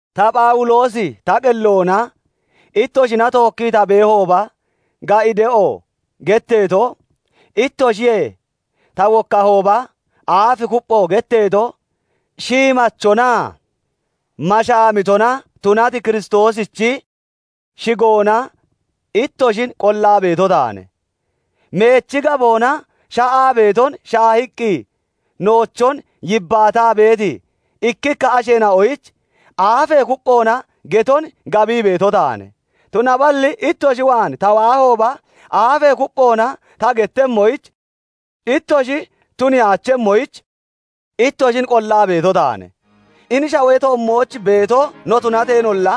Ta Phawuloosi, ta qelloona ittoshina tookkii ta beehooba "Ga'i de'o" getteeto, ittoshiyee ta wokkahooba "Aaf kuppho" getteeto, shiimachonaa mashaamitona tunati Kiristoosichi shigoona ittoshin qollaa beeto taane. Meechi gaboona sha'aa beeton shaahiiqqi noochon yibbaataa beeti ikkikka asheena'oyich aafee kupphoona geton gabii beeto taane; tunaballi ittoshi waan ta waahooba, aafee kupphoona ta gettemmoyich ittoshi tuniyaachemmoyich ittoshin qollaa beeto taane. Hini shawee toommooch beeto no tunateenolla,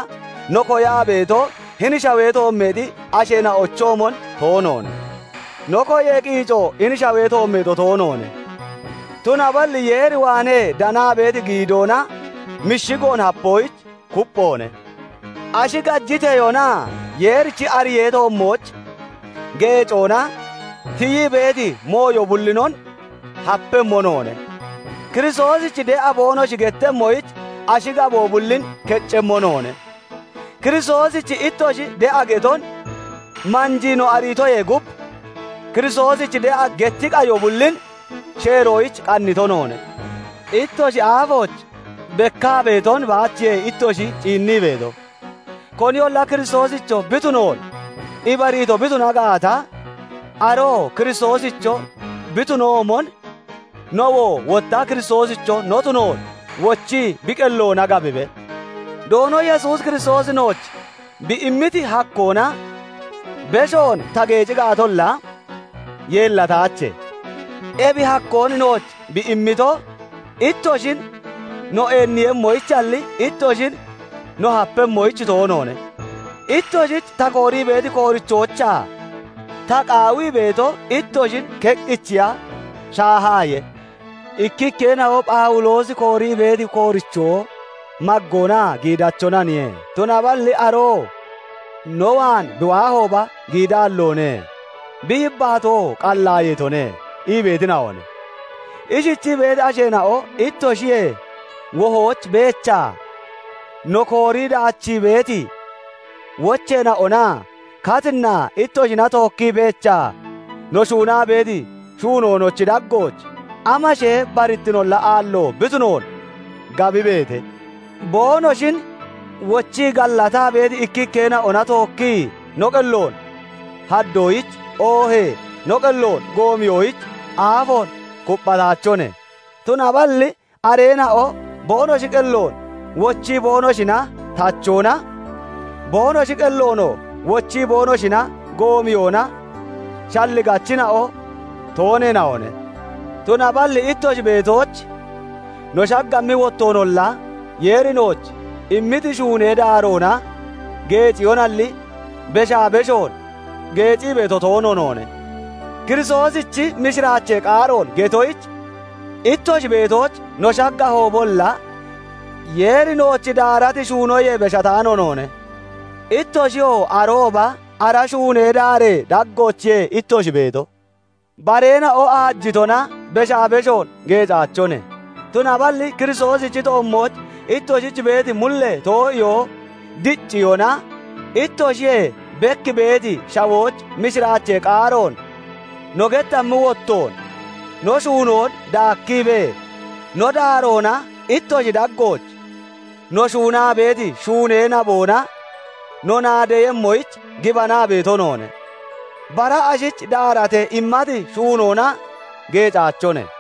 no koyaa beeto hini shawee toommeexi asheena'ochoomon toonoone; no koyee qiico hini shawee toommeexo toonoone; tunaballi Yeer waanee danaa beeti giidoona mishigoon hapoyich kupphoone. Ashi gajiteyoonaa Yeerichi ariyee toommooch geecoona tiyii beeti mooyo bullinon hapemmo noone; Kiristoosich de'a boonoshi gettemmoyich ashi gaboo bullin keccemmo noone; Kiristoosich ittoshi de'a geton manjii no ariitoyee gub, Kiristoosich de'a getti qayo bullin sheeroyich qannito noone. Ittoshi aafooch bekkaa beeton baachiye ittoshi ciinnii beeto; koniyolla Kiristoosicho bi tunoon ibariito bi tuna gaata, aroo Kiristoosicho bi tunoomon, nowoo wotta Kiristoosicho no tunoon wochi bi qelloona gabibe. Doono Yesuus Kiristoosi nooch bi immiti hakkoona beshoon ta geeci gaatolla, yeellataache; ebi hakkoon nooch bi immito, ittoshin no eenniiyemmoyichalli, ittoshin no hapemmoyich toonoone. Ittoshich ta koorii beeti koorichoochaa ta qaawii beeto, ittoshin keqqichiya shaahaaye. Ikkikkeena'o Phawuloosi koorii beeti koorichoo maggoonaa giidachonaniye; tunaballi aroo no waan bi beehooba giidaalloone; bi yibbaatoo qallaayeetone ii beetina'one. Ishichii beeti asheena'o ittoshiyee wohooch beechaa no koorii daachii beeti wocheena'onaa katinnaa ittoshina tookkii beechaa no shuunaa beeti shuunoonochi daggooch amashee barittinolla aallo bi tunoon gabibeete. Boonoshin wochii gallataa beeti ikkikkeena'ona tookkii no qelloon haddoyich, oohee no qelloon goomiyoyich aafoon kupphataachone; tunaballi areena'o boonoshi qelloon wochii boonoshina tachoona, boonoshi qelloonoo wochii boonoshina goomiyoona shalligachina'o tooneena'one. Tunaballi ittoshi beetooch no shaggammi wottoonolla, Yeeri nooch immiti shuunee daaroona geeciyonalli, beshaa beshoon geecii beeto toono noone. Kiristoosichi mishiraachee qaaroon getoyich ittoshi beetooch no shaggahoobolla, Yeeri nooch daarati shuunoyee beshataano noone; ittoshiyoo arooba ara shuunee daaree daggoochiye ittoshi beeto. Bareena'o aajitona beshaa beshoon geecaachone; tunaballi Kiristoosichi toommooch ittoshich beeti mullee too'iyoo dicciyona, ittoshiyee bek beeti shawooch mishiraachee qaaroon no gettammi wottoon, no shuunoon daakkibee, no daaroona ittoshi daggooch no shuunaa beeti shuunee naboona no naadeeyemmoyich gibanaa beeto noone; bara ashich daaratee immati shuunoona geecaachone.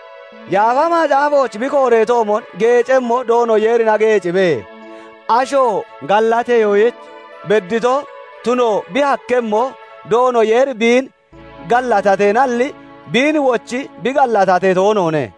Yaafa Macaafooch bi kooreetoomon, "Geecemmo Doono Yeerina geecibe." Asho gallateyoyich beddito tuno bi hakkemmo, Doono Yeeri biin gallatateenalli, biin wochii bi gallatatee toonoone.